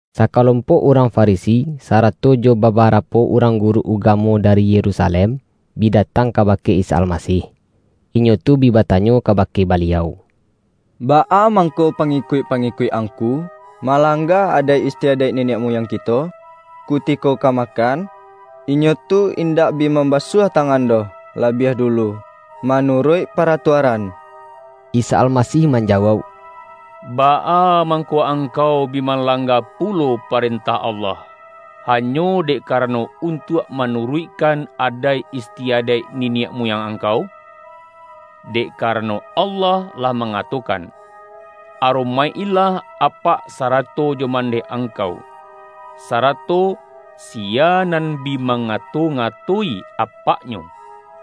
Sakalompok urang Farisi, sa-rato jo babarapo urang guru ugamo dari Yerusalem, bi datang ka-bake Isa Almasih. Inyo tu bi batanyo kabake Baliau, ”Baa mangko pangi-kuik-pangikuik Angku malangga adaik istiadaik niniak muyang kito? Kutiko ka makan, inyo tu indak bi mamba-suah tangan doh labiah dulu, manu-ruik paratuaran!” Isa Almasih manjawauk,”Baa mangko angkau bi malangga pulo pa-rentah Allah, hanyo dek karano un-tuak manuruikkan adaik istiadaik ni-niak muyang angkau? Dek karano, Allah lah mangatokan, ’Aromaik-ilah apak sarato jo mandeh angkau.’ sara-to, ’Siya nan bi mangato-ngato-i apak-nyo,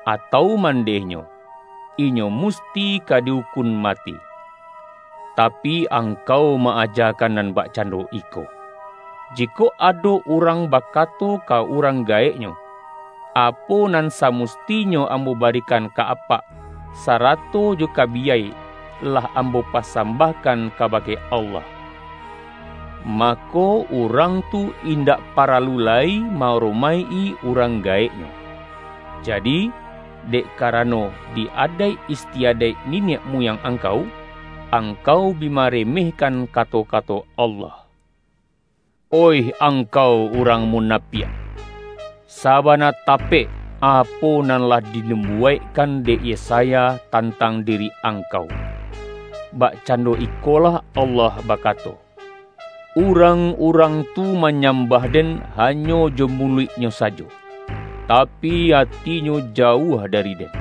atau mandehnyo, inyo musti ka di-ukun mati.’ Tapi, angkau ma-aja-kan nan bakcando iko: jikok ado urang bakato ka urang gaeknyo, ’Apo nan sa-mustinyo ambo barikan ka apak, sa-rato jo ka biyai, lah ambo pasambah-kan kabake Allah.’ mako, urang tu indak paralu lai ma-aromaik-i urang gaeknyo. Jadi, dek karano di adaik is-tiadaik niniak muyang angkau, ang-kau bi maremehkan kato-kato Allah. Oih angkau urang munapiak! Saba-na tapek, apo nan lah dinubuwaikkan dek Yesaya tantang diri angkau, ’Bakcando ikolah Allah bakato: Urang-urang tu manyambah Den hanyo jo muluiknyo sajo, tapi, atinyo jauah dari Den.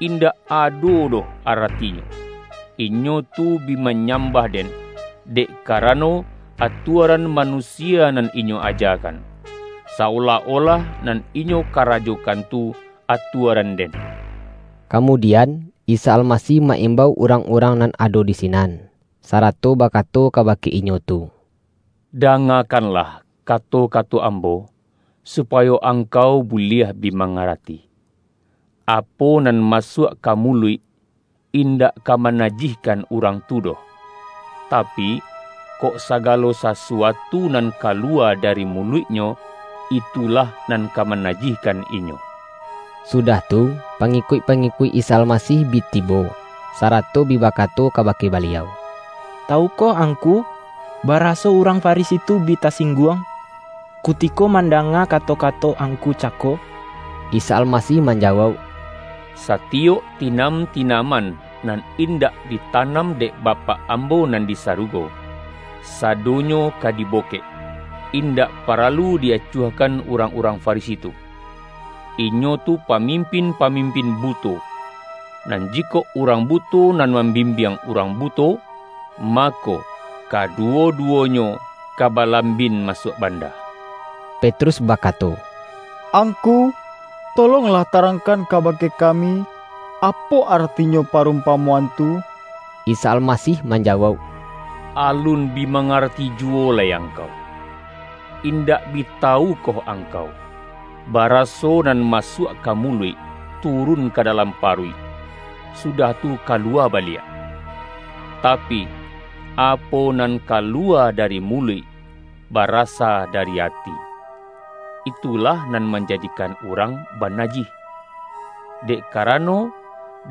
Indak ado doh aratinyo, inyo tu bi manyambah Den, dek karano, atuaran manusia nan inyo ajakan, sa-olah-olah nan inyo karajokan tu, atuaran-Den.’” Kamudian, Isa Almasih ma-imbau urang-urang nan ado di sinan, sarato bakato kabake inyo tu,”Dangakan-lah kato-kato Ambo, supayo angkau buliah bi mangarati! Apo nan ma-suak ka muluik, indak ka manajihkan urang tu doh; tapi, kok sagalo sasu-atu nan kaluwa dari muluiknyo, itu-lah nan ka manajihkan inyo.” Sudah tu, pangikuik-pangikuik Isa Almasih bi tibo, sarato bi bakato ka-bake Baliau,”Tawukoh Angku, baraso urang Farisi tu bi tasingguang, kutiko mandanga kato-kato Angku cako?” Isa Almasih manjawauk,”Satiyok tinam-tinaman, nan indak ditanam dek Bapak Ambo nan di sarugo, sa-donyo ka dibokek. Indak paralu di-acuahkan urang-urang Farisi tu. Inyo tu pamimpin-pamimpin buto; nan ji-kok urang buto nan mambimbiang urang buto, mako, kaduwo-duwonyo ka balambin masuak banda.” Petrus bakato,”Angku, tolonglah tarangkan kabake kami, apo aratinyo parumpamoan tu!” Isa Almasih manjawauk,”Alun bi mangarati juwo lai angkau? Indak bi tawu koh angkau, baraso nan masuak ka muluik, turun ka dalam paruik, su-dah tu kaluwa baliak? Tapi, apo nan kaluwa dari muluik, barasa dari ati; itulah nan manjadikan urang banajih. Dek karano,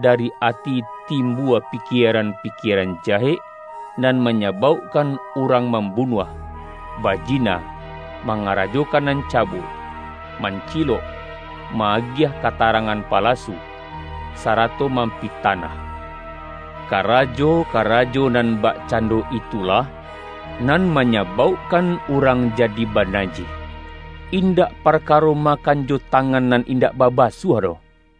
dari ati timbua pikie-ran-pikieran jahek, nan manyabaukkan urang mambunuah, bajina, mangara-jokan nan cabul, mancilok, ma-agiah katarangan palasu, sarato mampita-nah. Karajo-karajo nan bakcando itulah nan manyabaukkan urang jadi banajih, indak parkaro makan jo ta-ngan nan indak babasuah doh.”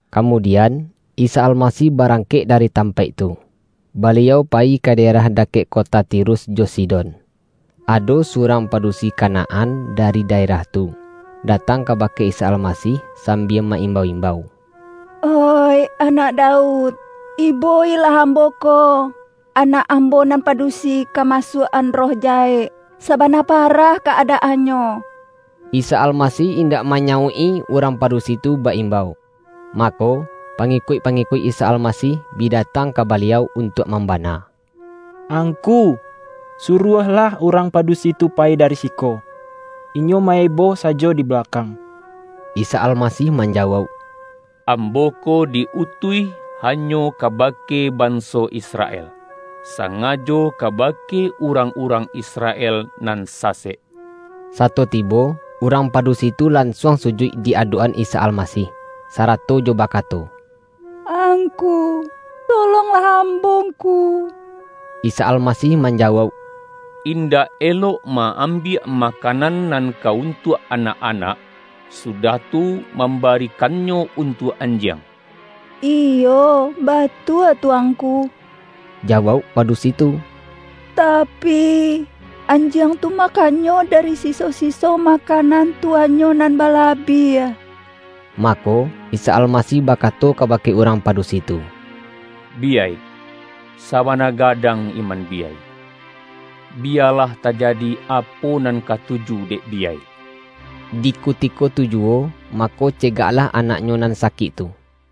Kamudian, Isa Almasih barangkek dari tampaik tu, Baliau payi ka daerah dakek kota Tirus jo Sidon. Ado su-rang padusi Kanaan dari daerah tu, datang kabake Isa Almasih sambia ma-imbau-imbau,”Oih Anak Daud, ibo-ilah ambo ko! Anak ambo nan pa-dusi ka masuak-an roh jahek. Sabana parah ka-adaannyo.” Isa Almasih indak manyauik-i urang padusi tu ba-imbau. Mako, pa-ngikuik-pangikuik Isa Almasih bi da-tang ka Baliau untuak mambana,”Ang-ku, suruahlah urang padusi tu payi dari siko. Inyo ma-eboh sajo di ba-lakang!” Isa Almasih manjawauk,”Ambo ko di-utuih hanyo kabake banso Isra-el, sangajo kabake urang-urang Isra-el nan sasek.” Sato tibo, urang padusi tu lan-suang sujuik di adok-an Isa Almasih, sarato jo bakato,”Angku, tolonglah ambo Ngku.” Isa Almasih manjawauk,”Indak elok ma-ambiak makanan nan ka un-tuak anak-anak, sudah tu, mambari-kannyo untuak anjiang.” ”Iyo, batua tu Angku,” jawauk pa-dusi tu,”tapi, anjiang tu makannyo dari siso-siso makanan tuannyo nan balabiah.” Mako, Isa Almasih bakato kaba-ke urang padusi tu,”Biyai, sabana ga-dang iman biyai! Biyalah tajadi apo nan katuju dek biyai!” Di kutiko tu juwo, mako cegaklah anaknyo nan sakik tu.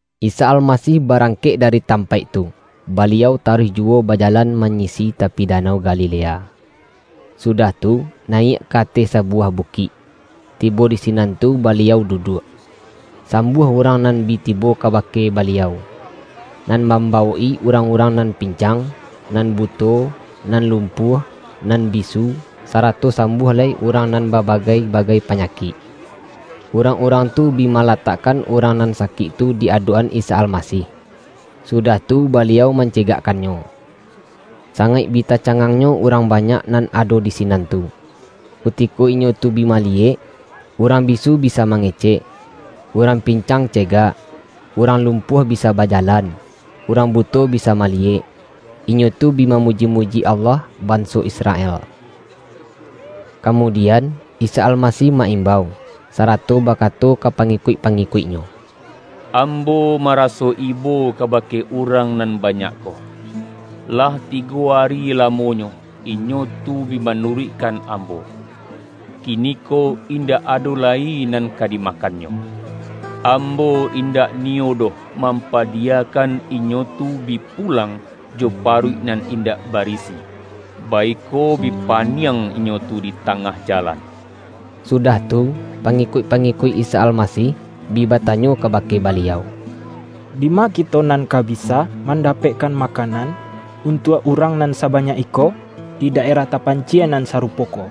Isa Almasih barangkek dari tam-paik tu, Baliau taruih juwo bajalan manyisi tapi Danau Galilea. Sudah tu, nayiak ka ateh sabuwah bukik, tibo di sinan tu Baliau duduak. Sambuah urang nan bi tibo kabake Baliau, nan mambawok-i urang-urang nan pin-cang, nan buto, nan lumpuah, nan bi-su, sarato sambuah lai urang nan ba-bagai-bagai panyakik. Urang-urang tu bi malatakkan urang nan sakik tu di adok-an Isa Almasih, sudah tu Baliau mancegakkannyo. Sangaik bi tacangangnyo urang banyak nan ado di sinan tu, kutiko inyo tu bi maliyek, urang bisu bisa mangecek, urang pin-cang cegak, urang lumpuah bisa baja-lan, urang buto bisa maliyek. Inyo tu bi mamuji-muji Allah banso Israel. Kamudian, Isa Almasih ma-imbau, sarato bakato ka pangikuik-pangikuik-Nyo,”Ambo maraso ibo kabake urang nan banyak ko. Lah tigo ari lamonyo, inyo tu bi manuruikkan Ambo, kini-ko indak ado lai nan ka dimakannyo. Ambo indak niyo doh mampadiyakan inyo tu bi pulang jo paruik nan indak barisi, baiko bi paniang inyo tu di ta-ngah jalan.” Sudah tu, pangikuik-pangikuik Isa Almasih, bi batanyo kabake Baliau,”Dima kito nan ka bisa mandapek-kan makanan, untuak urang nan sa-banyak iko, di daerah tapancie nan sarupo ko?”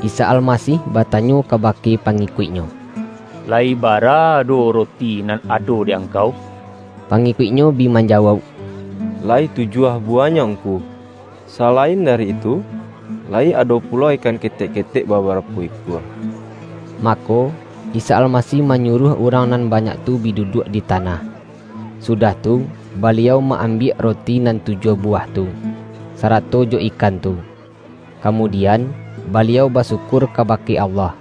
Isa Almasih batanyo kabake pa-ngikuik-Nyo,”Layi barado roti nan ado di angkau?” Pangikuik-Nyo bi manjawauk,”La-yi tujuah buwahnyo Ngku, salain da-ri itu, layi ado pulo ikan ketek-ketek babarapo ikua.” Mako, Isa Almasih manyuruah urang nan banyak tu bi duduak di ta-nah. Sudah tu, Baliau ma-ambiak ro-ti nan tujuah buwah tu, sarato jo ikan tu, kamudian, Baliau basyukur kabake Allah.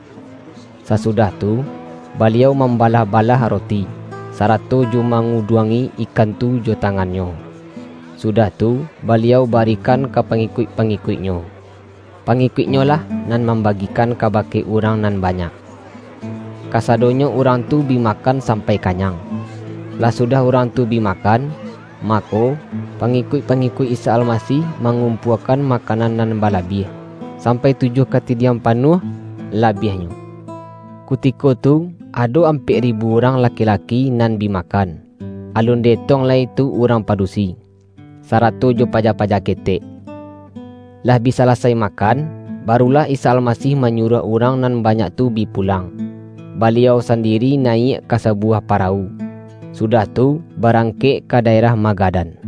Sasudah tu, Baliau mambalah-balah roti, sarato jo manguduangi ikan tu jo tangan-Nyo, sudah tu, Baliau ba-rikan ka pangikuik-pangikuik-Nyo. Pa-ngikuik-Nyo lah nan mambagikan ka-bake urang nan banyak. Kasadonyo urang tu bi makan sampai kanyang. Lah sudah urang tu bi makan, mako, pangikuik-pangikuik Isa Almasih ma-ngumpuakan makanan nan balabiah. Sampai tujuah katidiang panuah la-biahnyo. Kutiko tu, ado ampek ri-bu urang laki-laki nan bi makan, alun di-etong lai tu urang padusi, sarato jo paja-paja ketek. Lah bi salasai makan, barulah Isa Almasih manyuruah urang nan banyak tu bi pulang. Baliau sandiri nayiak ka sabuwah parawu, sudah tu, barang-kek ka daerah Magadan.